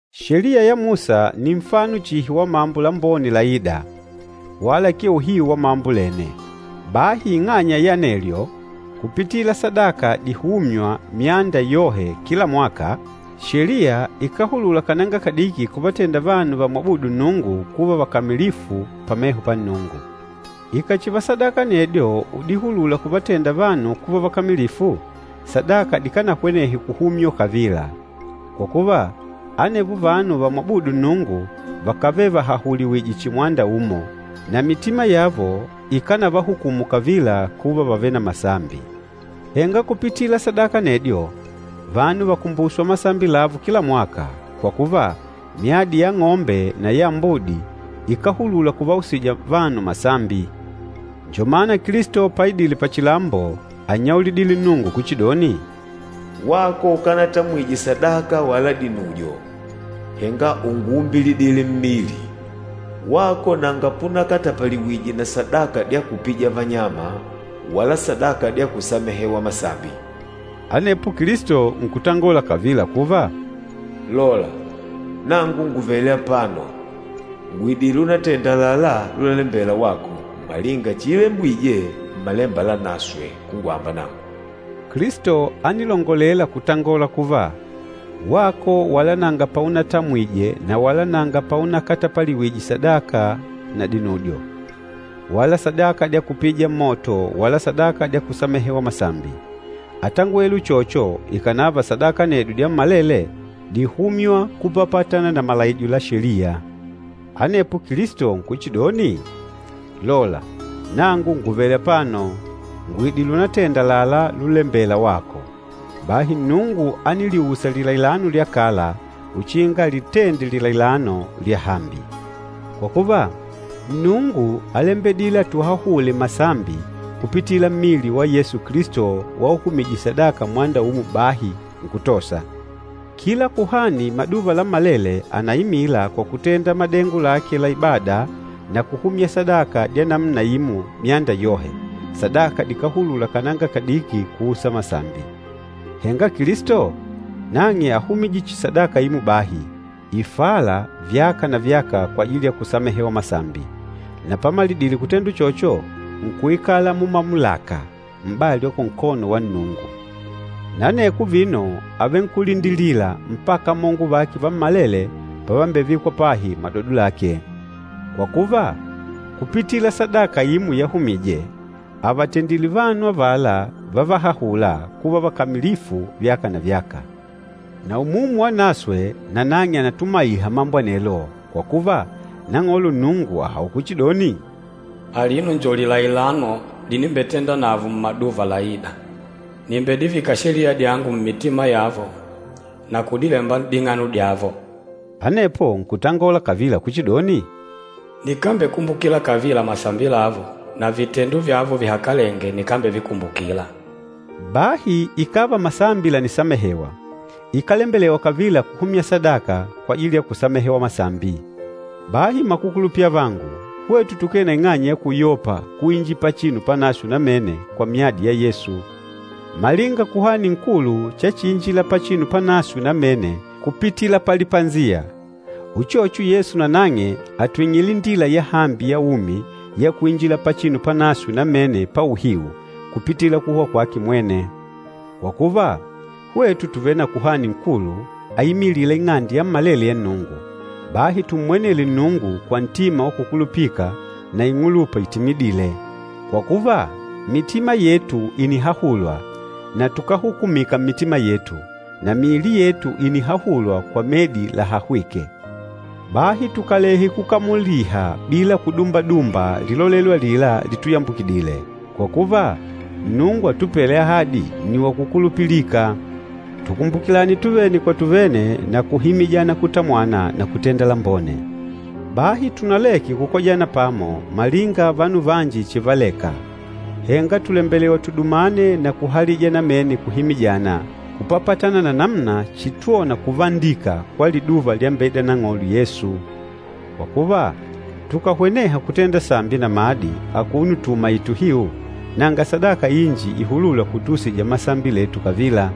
Sheliya ya Musa ni nfano chihi wa mambo lambone laîda, wala akee uhiu wa mambo lene. Bahi ing'anya ya anelyo, kupitila sadaka dihûmywa myanda yohe kila mwaka, Sheliya ikáhulula kananga kadiki kuvatenda vanu vamwabûdu Nnungu kuva vakamilifu pameho pa Nnungu. Ikàchiva sadaka anedyo udihulula kuvatenda vanu kuva vakamilifu, sadaka dikánahwenehe kuhumywa kavila. Kwa kuva, anevo vanu vamwabûdu Nnungu vakávele vahahuliwìjwè chihi mwanda umo, na mitima yavo ikánavahukumu kavila kuva vàvele na masambi. Henga kupitila sadaka anedyo, vanu vàkumbuswa masambi lavo kila mwaka, kwa kuva, myadi ya ang'ombe na ya ambudi ikáhulula kuvausija vanu masambi. Njo mana Kilisto paidile pachilambo ánnyaulidile Nnungu kuchidoni, “Wako ukanatamwije sadaka wala dinujo, henga únguumbilidile mmili. Wako nanga punakatapaliwije na sadaka dya kupija vanyama wala sadaka dya kusamehewa masambi.” Anepo Kilisto nkutangola kavila kuva, “Lola, nangu ngùvele apano, ngùidile unatenda àlalá lulalembela wako, malinga chiilembwije Mmalemba Lanaswe kungwamba nangu.” Kilisto ánilongolela kutangola kuva, “Wako wala nanga paunatamwije na wala nanga paunakatapaliwije sadaka na dinujo, wala sadaka dya kupija mmoto wala sadaka dya kusamehewa masambi.” Átangwele uchocho ikànava sadaka anedyo dyammalele díhumywa kupapatana na malaijo ya Sheliya. Anepo Kilisto nkuchidoni, “Lola, nangu ngùvele apano, ngùidile unatenda àlalá lulembêla wako.” Bahi Nnungu ániliusa lilailano lya kala uchinga alitende lilailano lyahambi. Kwa kuva, Nnungu álembedile atuhahule masambi kupitila mmili wa Yesu Kilisto wauhumije sadaka mwanda umo bahi, nkutosa. Kila kuhani maduva lammalele ànaimila kwa kutenda madengo lake la ibada na kuhumya sadaka dya namuna imo myanda yohe, sadaka dikáhulula kananga kadiki kuusa masambi. Henga Kilisto, nang'e áhumije chihi sadaka imo bahi, ifâla vyaka na vyaka kwajili ya kusamehewa masambi. Na pamalidile kutenda uchocho, nkuikala mumamulaka, m'bali wa kunkono wa Nnungu. Na aneko vino àvenkulindilila mpaka amongo vake vammalele pavambevikwa pahi madodo lake. Kwa kuva, kupitila sadaka imo yahumije, àvatendile vanu avala vávahahùlà kuva vakamilifu vyaka na vyaka. Na Umumu Wanaswe nanang'e ànatumaiha mambo anelo, kwa kuva, Nang'olo Nnungu àhaula kuchidoni, “Alino njo lilailano linimbetendanavo mmaduva laîda. Nìmbedivika Sheliya dyangu mmitima yavo na kudilemba n'ding'ano dyavo.” Anepo nkutangola kavila kuchidoni, “Nikambekumbukila kavila masambi lavo, na vitendo vyavo vihakalenge nikambevikumbukila.” Bahi ikàva masambi lànisamehewa, ikálembelewa kavila kuhumya sadaka kwajili ya kusamehewa masambi. Bahi mmakukulupila avangu, hwetu tukee na ing'anya ya kuyopa kuinjila Pachinu Panaswe Namene kwa myadi ya Yesu. Malinga Kuhani Nkulu chachiinjila Pachinu Panaswe Namene kupitila palipasiya, uchocho Yesu nanang'e àtwing'ile indila yahambi ya umi ya kuinjila Pachinu Panaswe Namene pa uhiu, kupitila kuhwa kwake mwene. Kwa kuva, hwetu tùvele na Kuhani Nkulu aimilîla ing'ande yammalele ya Nnungu, bahi tummwenele Nnungu kwa ntima wa kukulupika na ing'ulupa itimidîle. Kwa kuva, mitima yetu ìnihahulwa na tukáhukumika mmitima yetu, na miili yetu ìnihahulwa kwa medi lahahwîke. Bahi tukalehe kukamuliha bila kudumbadumba lilolelo alila lituyambukidile, kwa kuva, Nnungu atupêle ahadi nni wa kukulupilika. Tukumbukilane tuvene kwa tuvene na kuhimijana kutamwana na kutenda lambone. Bahi tunaleke kukojana pamo malinga vanu vanji chivaleka. Henga tùlembelewa tudumane na kuhalija namene kuhimijana, kupapatana na namuna chitwona kuvandika kwa liduva lyambeida Nang'olo Yesu. Kwa kuva, tukàhweneha kutenda sambi namadi akuno tuumaìtè uhiu, nanga sadaka inji ihulûla kutuusija masambi letu kavila.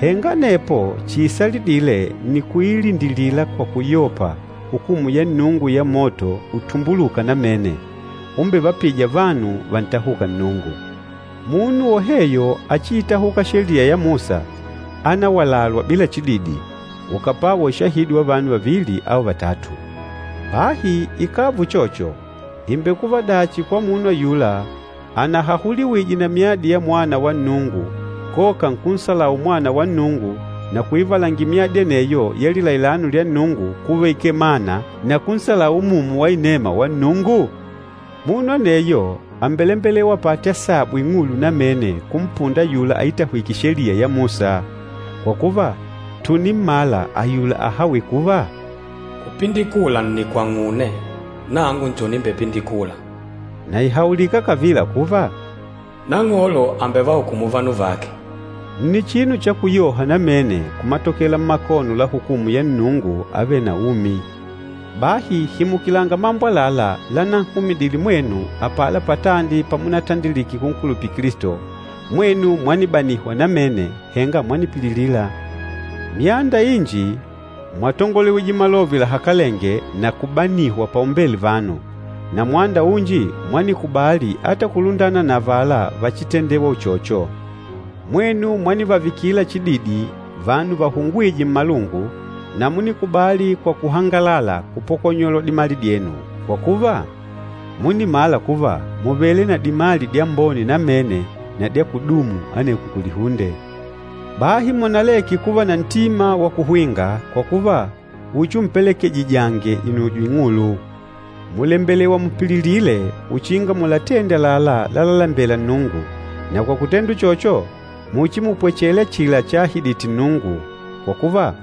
Henga anepo chiisalidîle nni kuiilindilila kwa kuyopa hukumu ya Nnungu ya moto utumbulûka namene, umbevapîja vanu vantahûka Nnungu. Munu woheyo áchiitahuka Sheliya ya Musa, ánawalalwa bila chididi, ukàpwawa ushahidi wa vanu vavili au vatatu. Bahi ikàva uchocho, ìmbekuva dachi kwa munu ayula anahahuliwije na myadi ya Mwana wa Nnungu koka nkunsalau Mwana wa Nnungu na kuivalangila myadi aneyo ya lilailano lya Nnungu kuva ikee mana na kunsalau Umumu wa Inema wa Nnungu? Munu aneyo àmbelembelewa apate asabu ing'ulu namene kumpunda ayula aitahwîke Sheliya ya Musa. Kwa kuva, tùnimmala ayula ahawîle kuva, “Kupindikula nni kwang'une, nangu njo nimbepindikûla.” Na ìhaulika kavila kuva, “Nang'olo àmbevahukumu vanu vake.” Nni chinu cha kuyoha namene kumatokela mmakono la hukumu ya Nnungu avêle na umi! Bahi himukilanga mambo àlalá lananhumidile mwenu apala patandi pamunatandilike kunkulupila Kilisto, mwenu mwanibanihwa namene, henga mwanipililila. Myanda inji mwatongolewije malove lahakalenge na kubanihwa paumbele vanu, na mwanda unji mwanikubali ata kulundana na avala vachitendêwa uchocho. Mwenu mwanivavikila chididi vanu vahungwîje mmalungu, na múnikubali kwa kuhangalala kupokonyolwa dimali dyenu, kwa kuva, múnimala kuva mùvele na dimali dyambone namene na dya kudumu aneko kulihunde. Bahi munaleke kuva na ntima wa kuhwinga, kwa kuva, uchiumpelekejijange inujo ing'ulu. Mùlembelewa mupililile uchinga mulatende àlalá lalalembela Nnungu, na kwa kutenda uchocho, muchimupwechele achila chaahidite Nnungu. Kwa kuva,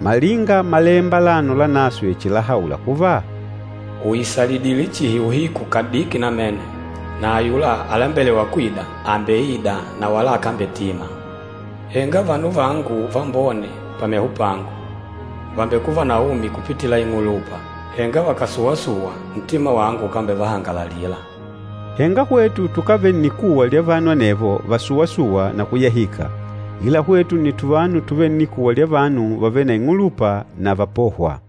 malinga Malemba alano Lanaswe chilahaula kuva, “Ùisalidile chihi uhiku kadiki namene, na ayula alembelêwa kwida, àmbeida na wala akambetima. Henga vanu vangu vambone pameho pangu, vàmbekuva na umi kupitila ing'ulupa. Henga vakàsuwa-suwa, ntima wangu ukambevahangalalila.” Henga hwetu tukávele nnikuwa lya vanu anevo vasuwa-sûwa na kuyahika, ila hwetu nni tuvanu tuvêle nnikuwa lya vanu vavêle na ing'ulupa na vapôhwa.